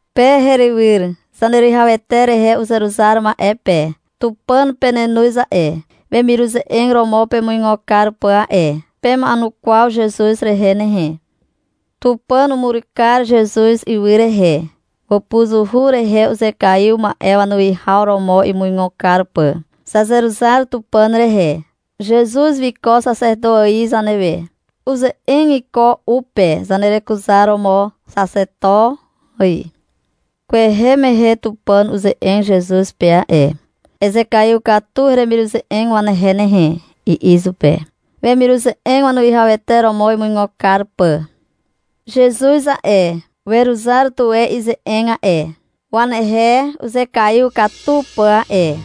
Pe herywyr Zaneruwihawete rehe uzeruzar ma'e pe. Tupàn penenoz a'e, wemiruze'eg romo pemuigo kar pà a'e. Pema'enukwaw Zezuz rehe nehe. Tupàn umur kar Zezuz ywy rehe, wàpuzuhu rehe uzekaiw ma'e wanuwihaw romo imuigo kar pà. Zazeruzar Tupàn rehe. Zezuz wiko xaxeto ài zanewe. Uze'eg iko u pe zanerekuzaromo, xaxeto ài. Kwehe mehe Tupàn uze'eg Zezuz pe a'e. — Ezekaiw katu heremiruze'eg wanehe nehe, i'i izupe, wemiruze'eg wanuwihawete romo imuigo kar pà. Zezuz a'e, weruzar tuwe ize'eg a'e, wanehe uzekaiw katu pà a'e.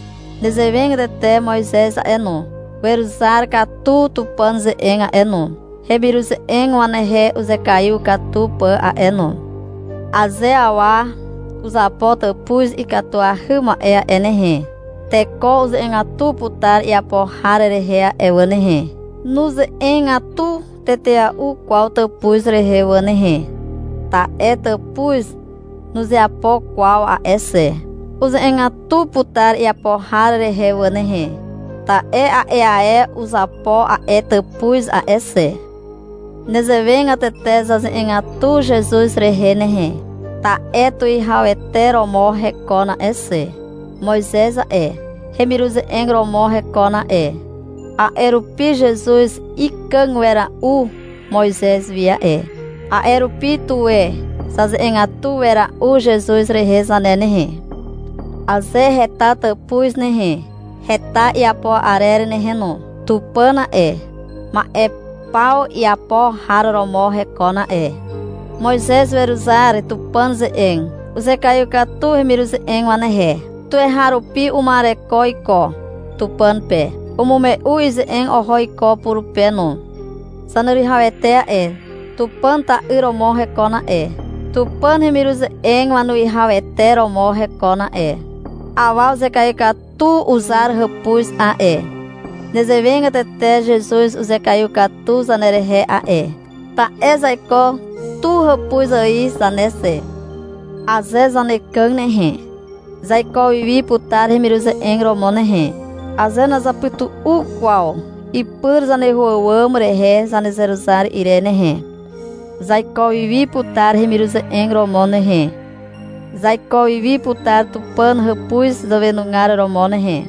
Nezewegatete Moizez a'e no, weruzar katu Tupàn ze'eg a'e no, hemiruze'eg wanehe uzekaiw katu pà a'e no. Aze awa uzapo tàpuz ikatuahy ma'e a'e nehe, teko uze'egatu putar iapo har rehe a'e wà nehe. Nuze'egatu tetea'u kwaw tàpuz rehe wà nehe, ta'e tàpuz nuzeapo kwaw a'e xe. Uze'egatu putar iapo har rehe wà nehe, ta'e a'e ae uzapo a'e tàpuz a'e xe. Nezewegatete zaze'egatu Zezuz rehe nehe, ta'e tuwihawete romo hekon a'e xe. Moizez a'e, hemiruze'eg romo hekon a'e. A'e rupi Zezuz ikàg wera'u Moizez wi a'e. A'e rupi, tuwe zaze'egatu wera'u Zezuz rehe zane nehe. Aze heta tàpuz nehe, heta iapo arer nehe no. Tupàn a'e, ma'e paw iapo har romo hekon a'e. Moizez weruzar Tupàn ze'eg. Uzekaiw katu hemiruze'eg wanehe. Tuweharupi uma'ereko iko Tupàn pe. Umume'u ize'eg oho iko purupe no. Zaneruwihawete a'e, Tupàn ta'yr romo hekon a'e. Tupàn hemiruze'eg wanuwihawete romo hekon a'e. Awa uzekaiw katu uzar hàpuz a'e. Nezewegatete Zezuz uzekaiw katu zanerehe a'e, ta'e zaiko tu hàpuz ài zane xe. Aze zanekàg nehe, zaiko wiwi putar hemiruze'eg romo nehe. Aze nazapytu'u kwaw ipyr zaneho àwàm rehe zanezeruzar ire nehe, zaiko wiwi putar hemiruze'eg romo nehe, zaiko wiwi putar Tupàn hàpuz zàwenugar romo nehe.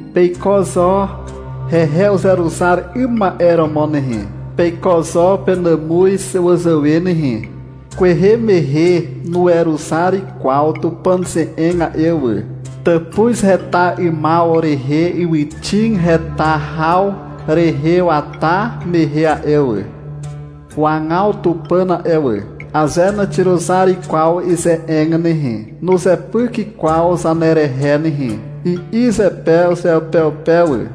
peiko zo hehe uzeruzar 'ym ma'e romo nehe. Peiko zo penàmuz wazàwe nehe. Kwehe mehe nuweruzar kwaw Tupàn ze'eg a'e wà, tàpuz heta 'ymaw rehe ywyxig heta haw rehe wata mehe a'e wà. Wagaw Tupàn a'e wà. — Aze naxiruzar kwaw ize'eg nehe, nuzepyk kwaw zanerehe nehe, i'i zepe uzeupeupe wà.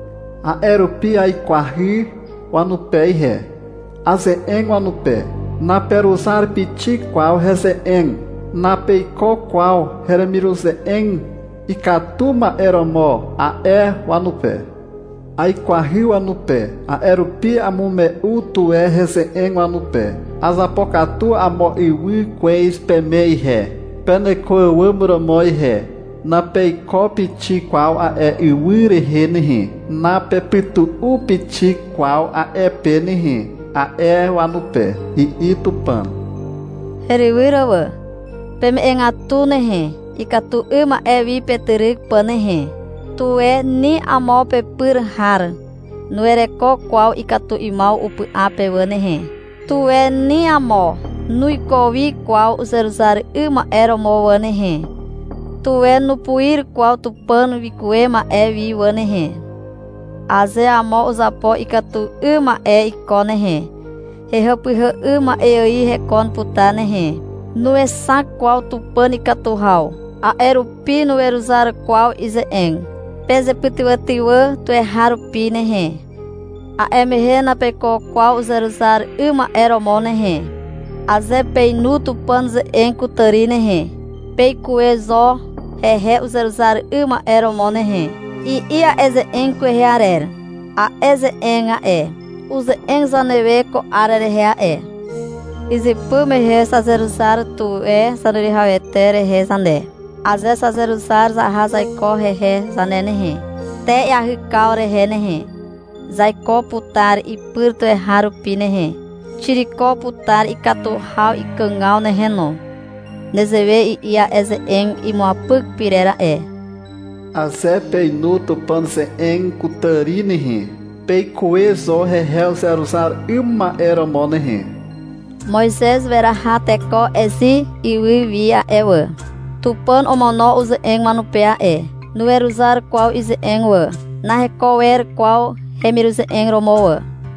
A'e rupi aikwahy wanupe ihe. Aze'eg wanupe. — Naperuzar pixik kwaw heze'eg, napeiko kwaw heremiruze'eg ikatu ma'e romo, a'e wanupe. Aikwahy wanupe. A'e rupi amume'u tuwe heze'eg wanupe. — Azapokatu amo ywy kwez peme ihe, peneko àwàm romo ihe. Napeiko pixik kwaw a'e ywy rehe nehe. Napepytu'u pixik kwaw a'e pe nehe, a'e wanupe, i'i Tupàn. Herywyr wà. Peme'egatu nehe, ikatu 'ym ma'e wi petyryk pà nehe. Tuwe ni amo pepyr har nuwereko kwaw ikatu 'ymaw upy'a pe wà nehe. Tuwe ni amo nuiko wi kwaw uzeruzar 'ym ma'e romo wà nehe. Tuwe nupuir kwaw Tupàn wikuwe ma'e wi wà nehe. Aze amo uzapo ikatu 'ym ma'e iko nehe, hehàpyhà 'ym ma'e ài hekon putar nehe. Nuexak kwaw Tupàn ikatu haw. A'e rupi nuweruzar kwaw ize'eg. Pezepytywàtywà tuweharupi nehe. A'e mehe napeiko kwaw uzeruzar 'ym ma'e romo nehe. Aze peinu Tupàn ze'eg kutàri nehe, peikuwe zo hehe uzeruzar 'ym ma'e romo nehe, i'i a'e ze'eg kwehe arer. A'e ze'eg a'e, uze'eg zanewe ko 'ar rehe a'e. Izypy mehe zazeruzar tuwe Zaneruwihawete rehe zane. Aze zazeruzar zaha zaiko hehe zane nehe, te iahykaw rehe nehe, zaiko putar ipyr tuweharupi nehe. Xiriko putar ikatu haw ikàgaw nehe no. Nezewe i'i a'e ze'eg imuapyk pyrer a'e. — Aze peinu Tupàn ze'eg kutàri nehe, peikuwe zo hehe uzeruzar 'ym ma'e romo nehe. Moizez weraha teko Ezit ywy wi a'e wà. Tupàn omono uze'eg wanupe a'e. Nuweruzar kwaw ize'eg wà. Naheko wer kwaw hemiruze'eg romo wà.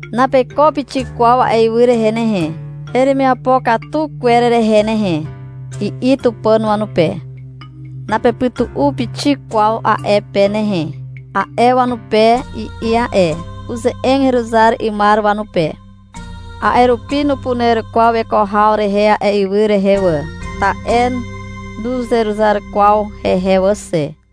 — Napeiko pixik kwaw a'e ywy rehe nehe, heremiapo katu kwer rehe nehe, i'i Tupàn wanupe. — Napepytu'u pixik kwaw a'e pe nehe, a'e wanupe, i'i a'e. Uze'eg heruzar 'ymar wanupe. A'e rupi nupuner kwaw weko haw rehe a'e ywy rehe wà, ta'e nuzeruzar kwaw hehe wà xe.